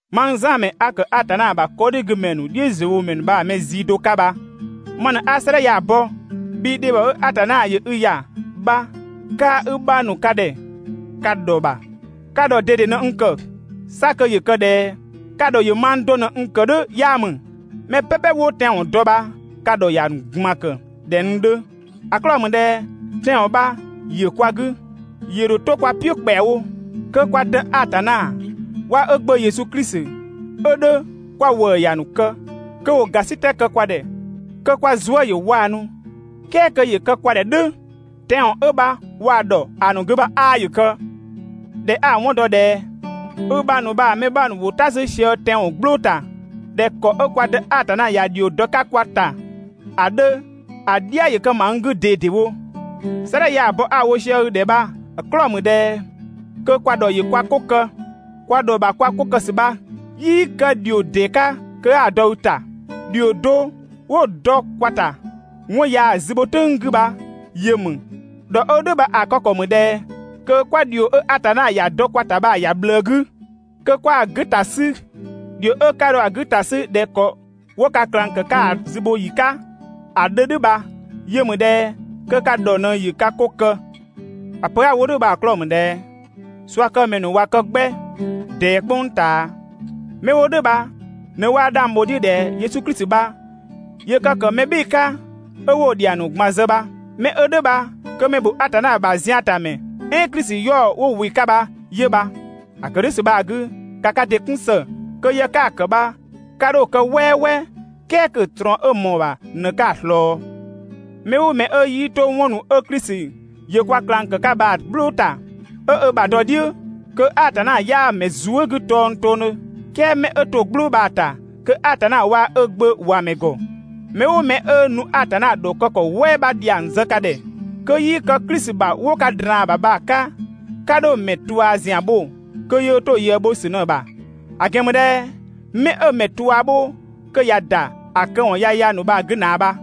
Mang Zan ‑mɛ 'a ‑kë Atanna ‑bha 'kɔdhigümɛ ‑nu "dhiʋ̈ziöwomɛ ‑nu bha‑ mɛ zii do 'ka bha ma ꞊në 'a 'sëëdhɛ ya‑ bɔ, bhii dhebhɔ 'ö Atanna ‑yö i ‑ya bha kaa‑ i bhang ‑nu ka ‑dhɛ ka ‑dhɔ ‑bha. Ka ‑dhɔ ꞊dede ꞊në n ‑kë. 'Sa kö ‑yö kë ꞊dhɛ ka ‑dhɔ ‑yö mang do ꞊në n ‑kë "dhʋ̈ 'yaa ‑mü. Mɛ "pɛpɛ 'wo tɛanwɔn dɔ bha ka ‑dhɔ ‑ya ‑nu ꞊gban ‑kë ꞊dhɛ n 'dhö. ‑A 'klɔɔ‑ ‑mü ꞊dhɛ tɛanwɔn bha ‑yö kwa 'gü, ‑yö ‑dho 'to kwa "piʋ̈ ‑kpɛawo. Kö kwa Dë Atanna waa‑ ö Gbö Yesu Klisi 'ö 'dhö kwa ‑wëë ‑ya ‑nu kë, kö ‑wo ‑gasitɛ kë kwa ‑dhɛ, kö kwa zuë" ‑yö 'waanu, "kɛɛ kö ‑yö kë kwa ‑dhɛ "dhʋ̈ tɛanwɔn 'ö bha waa‑ ‑dhɔ ‑a ‑nu 'gü bha 'aa ‑yö kë! ꞊Dhɛ 'a‑ 'wɔn dɔ ꞊dhɛ i bhang ‑nu bha‑ mɛ 'bha ‑nu ‑wo "ta 'sü sië tɛanwɔn "gblʋʋ ‑ta ꞊dhɛ ‑kɔ 'ö kwa Dë Atanna ‑ya ‑dhio dɔ‑ 'ka kwa ‑ta ‑a 'dhö, ‑a "dhia‑ kë ‑ma n 'gü ꞊dedewo. 'Sëëdhɛ ya‑ bɔ 'a‑ wo sië i ‑dhɛ bha‑ 'klɔɔ‑ ‑mü ꞊dhɛ kö kwa ‑dhɔ ‑yö kwa 'ko kë. Kwa ‑dhɔ ‑bha kwa 'ko kë ‑sü bha 'yii kë ‑dhio ‑dee 'ka kö 'a‑ dɔ i ‑ta. ‑Dhio do 'wo dɔ kwa ‑ta 'wɔn ya‑ zü bho "tʋ̈ng 'gü bha yö ‑mü. ‑Dhɔ 'ö "dhʋ̈ bha‑ kë ‑kɔ ‑mü ꞊dhɛ kö 'kwa ‑dhio 'ö Atanna ‑ya dɔ kwa ‑ta bha‑ ‑ya ꞊bhlëë 'gü, kö 'kwa‑ 'gü ‑ta 'sü. ‑Dhio 'ö 'ka dho‑ 'gü ‑ta 'sü ꞊dhɛ ‑kɔ 'wo ka ꞊klang ‑kë 'ka ‑a zü bho ‑yi 'ka ‑a 'dhö "dhʋ̈ bha 'yö ‑mü ꞊dhɛ kö ka ‑dhɔ ꞊në ‑yö ka 'ko kë. ‑A pö 'a‑ wo "dhʋ̈ bha‑ 'klɔɔ‑ ‑mü ꞊dhɛ ꞊suakëmɛ ‑nu ꞊wa kë 'gbɛ ꞊dɛɛ "kpʋng ꞊taa. 'Mɛ 'wo "dhʋ̈ bha ꞊në 'waa 'dhang bho‑ "dhiʋ̈ ꞊dhɛ Yesu Klisi bha ‑yö kë ‑kë mɛ "bhɩɩ‑ 'ka 'ö 'wo‑ ‑dhiang ‑nu ꞊gban zë bha. 'Mɛ 'ö "dhʋ̈ bha kö mɛ ‑bho Atanna ‑bha ziantamɛ, "ɛɛn Klisi 'yaɔ‑ 'wo ‑wɩ 'ka bha 'yö bha. ‑A ‑kë "dhʋ̈ ‑sü bha‑ 'gü, ‑ka ka ‑dɩ 'kun ‑së kö yë 'ka‑ ‑kë bha 'ka 'dho‑ kë "wɛɛwɛɛ, "kɛɛ kö‑ ꞊trɔɔn 'ö ꞊mɔɔ‑ ‑bha ꞊në 'ka‑ ꞊slɔɔ. Mɛ "ʋʋ mɛ 'ö 'yii 'to 'wɔn ‑nu 'ö Klisi ‑yö kwa ꞊klang ‑kë 'ka bha‑ "gblʋʋ ‑ta 'ö ö ‑bha dɔ‑ "dhiʋ̈, kö Atanna 'yaa‑ ‑mɛ zuë" 'gü tongtongdhö. "Kɛɛ 'mɛ 'ö to‑ "gblʋʋ bha‑ ‑ta, kö Atanna waa‑ ö Gbö ‑wa ‑mɛ ‑gɔ. Mɛ "ʋʋ mɛ 'ö nu Atanna ‑dhɔkë ‑kɔ "wɛɛ bha ‑dhiang zë ka ‑dhɛ kö 'yii kë Klisi ‑bha 'wo ka ꞊draan‑ ‑bha bha‑ 'ka, 'ka 'dho‑ ‑mɛ ꞊tua ‑zian bho kö yöö 'to‑ ꞊yëë bho ‑sü ꞊në‑ bha. ‑A ‑gɛn ‑mü ꞊dhɛ 'mɛ 'ö‑ ‑mɛ ꞊tua bho kö ꞊ya ‑da ‑a këwɔn yaya ‑nu bha‑ 'gü ꞊naa bha.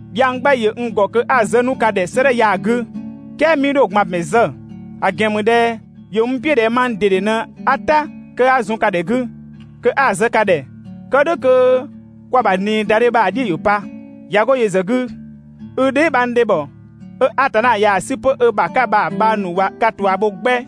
Dhiang 'gbɛ ‑yö n ‑gɔ kö 'a‑ zë 'nu ka ‑dhɛ 'sëëdhɛ ya‑ 'gü, "kɛɛ 'mii 'dho‑ ꞊gban ‑bɛn zë. ‑A ‑gɛn ‑mü ꞊dhɛ ‑yö n "piʋ̈ ꞊dhɛ mang ꞊dede ꞊në 'a "ta kö 'a zun ka ‑dhɛ 'gü kö 'a‑ zë ka ‑dhɛ, kë "dhʋ̈ kö kwa ‑bha ꞊niidadhe bha‑ "dhiʋ̈ ‑yö pa. ꞊Ya 'go yö ‑zë 'gü, i dheebhang ‑dhebhɔ 'ö Atanna ꞊yaa‑ 'sü 'pö ö ‑bha 'ka bha‑ bhang ‑nu ꞊wa ka ꞊tua bho 'gbɛ.